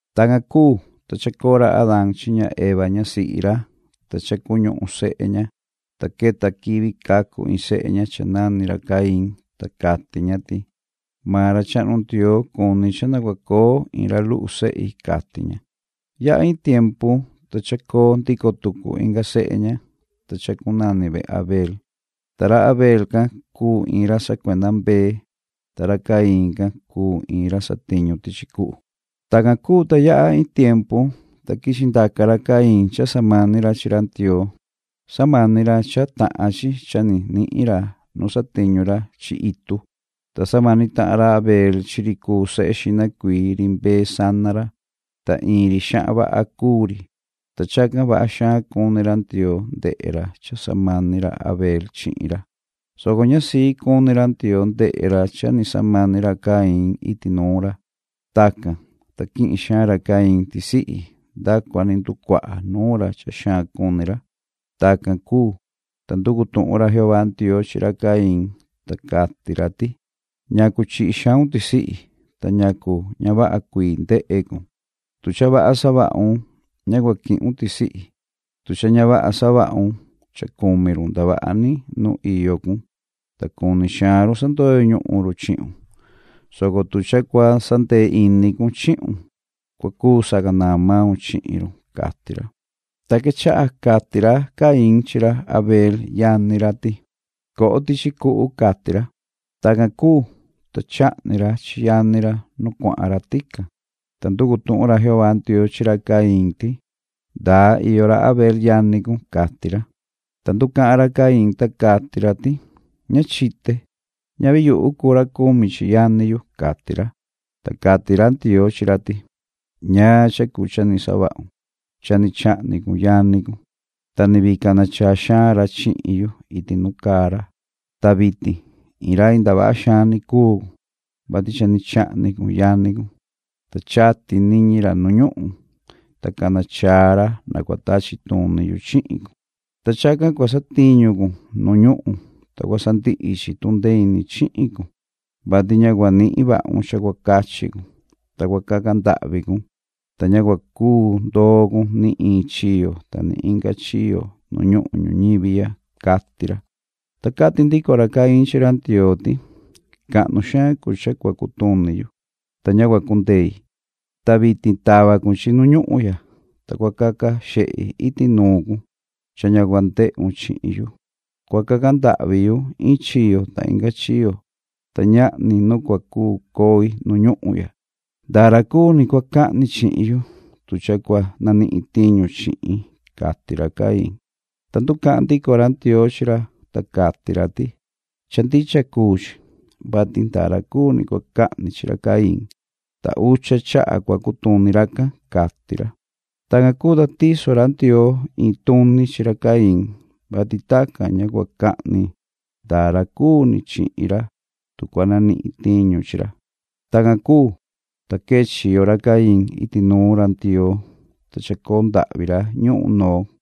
Tacan cuu, ta chacoo ra Adaan chi ña Eva ñasihi ra, ta cha cuñuhun sehe ña, ta queta quivi cacu in sehe ña cha nani ra Caín, ta cati ña ti: “Maan ra chahnu Ndioo cuni cha na cua coo in ra luhu sehi”, cati ña. Yaha in tiempu, ta chacoo ndico tucu inga sehe ña, ta chacunani ve Abel. Ta ra Abel can cuu in ra sacuenda mbee chi chivu, ta ra Caín can cuu in ra satiñu tichi cuhu. Tacan cuu, ta yaha in tiempu, ta quichi ndaca ra Caín cha cua samani ra chi ra Ndioo. Cha samani ra cha tahan chi cha ni nihin ra nu satiñu ra chi itu. Ta samani tahan ra Abel chi ri cuu sehe xihna cuii ri mbee a chivu sana ra, ta in ri xahan vaha cuu ri, ta chacan vaha xaan cuni ra Ndioo ndehe ra cha samani ra Abel chihin ra, soco ña sii cuni ra Ndioo ndehe ra cha ni samani ra Caín iti nuun ra. Tacan, ta quihin xaan ra Caín tisihi nda cua ni nducuaha nuun ra cha xaan cuni ra. Tacan cuu, ta nducu tuhun ra Jehová Ndioo chi ra Caín, ta cati ra ti: “¿Ñacu chihi xaun tisihi, ta ñacu ña vaha cuii ndehe cun? Tu cha vaha savahun, ña cua quihun tisihi. Tu cha ña vaha savahun, cha cumi run ndavaha ni nu iyo cun, ta cuni xaan run sandoyo ñuhun run chihun, soco tu cha cua sandee ini cun chihun, cua cuu sacanaan maun chihin run”, cati ra. Ta quechaha cati ra Caín chi ra Abel yani ra ti: ―Coho tichi cuhu ―cati ra. Tacan cuu, ta chahni ra chi yani ra nu cuahan ra tican. Ta nducu tuhun ra Jehová Ndioo chi ra Caín ti: ―¿Ndaa iyo ra Abel yani cun? ―cati ra. Ta nducahan ra Caín, ta cati ra ti: ―Ña chite. Ñavi yuhu cuu ra cumi chi yani yu ―cati ra. Ta cati ra Ndioo chi ra ti: ―¿Ñaan cha cuu cha ni savahun? Cha ni chahni cun yani cun, ta ni vii cana chaa xaan ra chihin yu iti nu caa ra. Ta vitin, in rai ndavaha xaan ni cuu cun, vati cha chahni cun yani cun, ta chati niñi ra nu ñuhun, ta cana chaa ra na cua tachi tuni yu chihin cun. Ta chacan cua satiñu cun nu ñuhun, ta cua sandihi chi tundee ini chihin cun, vati ña cua nihin vahun cha cua cachi cun, ta cua caca ndahvi cun, ta ña cua cuu ndoo cun ni in chiyo ta ni inga chiyo nu ñuhun ñuñivi ya ―cati ra. Ta cati ndico ra Caín chi ra Ndioo ti: ―Cahnu xaan cuu cha cua cutuni yu, ta ña cua cundei. Ta vitin tava cun chi nu ñuhun ya, ta cua caca xehi iti nuun cun cha ña cua ndehun chihin yu. Cua caca ndahvi yu in chiyo ta inga chiyo, ta ñahni nu cua cuu coi nu ñuhun ya. Ndaa ra cuu ni cua cahni chihin yu, tu cha cua nanihin tiñu chihin ―cati ra Caín. Ta nducahan ndico ra Ndioo chi ra, ta cati ra ti: ―Cha ndicha cuu chi, vati ndaa ra cuu ni cua cahni chi ra Caín, ta ucha chaha cua cutuni racan ―cati ra. Tacan cuu, ta tiso ra Ndioo in tuni chi ra Caín, vati tacan ña cua cahni ndaa ra cuu ni chihin ra tu cua nanihin tiñu chi ra. Tacan cuu, ta quee chiyo ra Caín iti nuun ra Ndioo, ta chacoo ndahvi ra ñuhun Nod.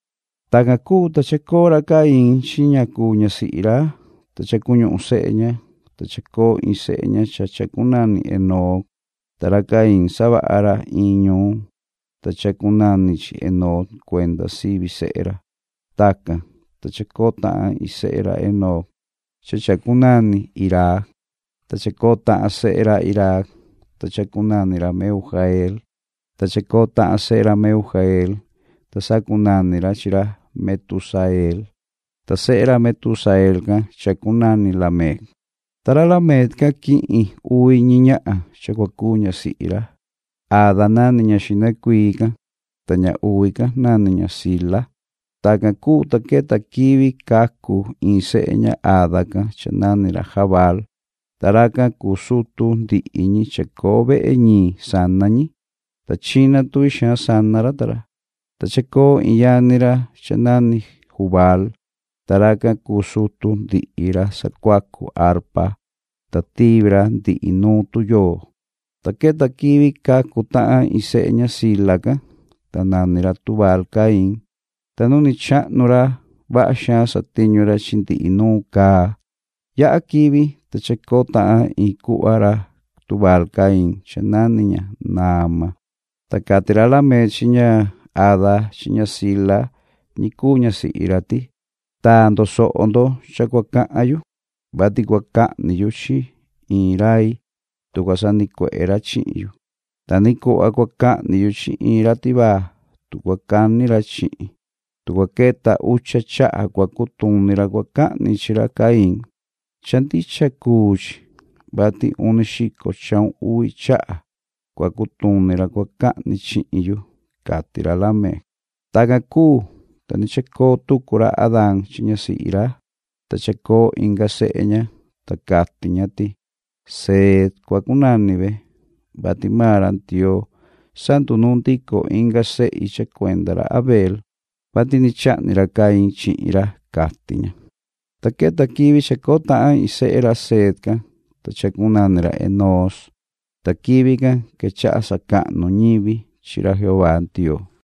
Tacan cuu, ta chacoo ra Caín chi ña cuu ñasihi ra, ta cha cuñuhun sehe ña, ta chacoo in sehe ña cha chacunani Enoc, ta ra Caín savaha ra in ñuun, ta chacunani chi Enoc cuenda sivi sehe ra. Tacan, ta chacoo tahan in sehe ra Enoc cha chacunani Iraad, ta chacoo tahan sehe ra Irad, ta chacunani ra Mehujael, ta chacoo tahan sehe ra Mehujael, ta sacunani ra chi ra Metusael, ta sehe ra Metusael can chacunani Lamec. Ta ra Lamec can quihin uvi ñi ñahan cha cua cuu ñasihi ra. Ada nani ña xihna cuii can, ta ña uvi can nani ña Zila. Tacan cuu, ta queta quivi cacu in sehe ña Ada can cha nani ra Jabaal, ta racan cuu sutu ndihi ñi chacoo vehe ñiin sana ñi, ta china tuvi xaan sana ra ta ra. Ta chacoo in yani ra cha nani Jubaal, ta racan cuu sutu ndihi ra sacuacu arpa, ta tivi ra ndihi nuun tuyoo. Ta queta quivi cacu tahan in sehe ña Zila can, ta nani ra Tubal-Caín, ta nu ni chahnu ra vaha xaan satiñu ra chi ndihi nuun caa. Yaha quivi, ta chacoo tahan in cuhva ra Tubal-Caín cha nani ña Naama. Ta cati ra Lamec chi ña Ada chi ña Zila ñi cuu ñasihi ra ti: “Taa ndo soho ndo cha cua cahan yu, vati cua cahni yu chi in rai tu cua sanicuehe ra chihin yu. Ta ni cuhva cua cahni yu chi in ra tivaa, tu cua cani ra chihin. Tu cua queta ucha chaha cua cutuni ra cua cahni chi ra Caín, cha ndicha cuu chi, vati uni xico chahun uvi chaha cua cutuni ra cua cahni chihin yu”, cati ra Lamec. Tacan cuu, ta ni chacoo tucu ra Adaan chi ñasihi ra, ta chacoo inga sehe ña, ta cati ña ti:” Seet cua cunani ve, vati maan ra Ndioo sandunuun ndico inga sehi cha cuenda ra Abel, vati ni chahni ra Caín chihin ra”, cati ña. Ta queta quivi chacoo tahan in sehe ra Seet can, ta chacunani ra Enoos. Ta quivi can quechaha sacahnu ñivi chi ra Jehová Ndioo.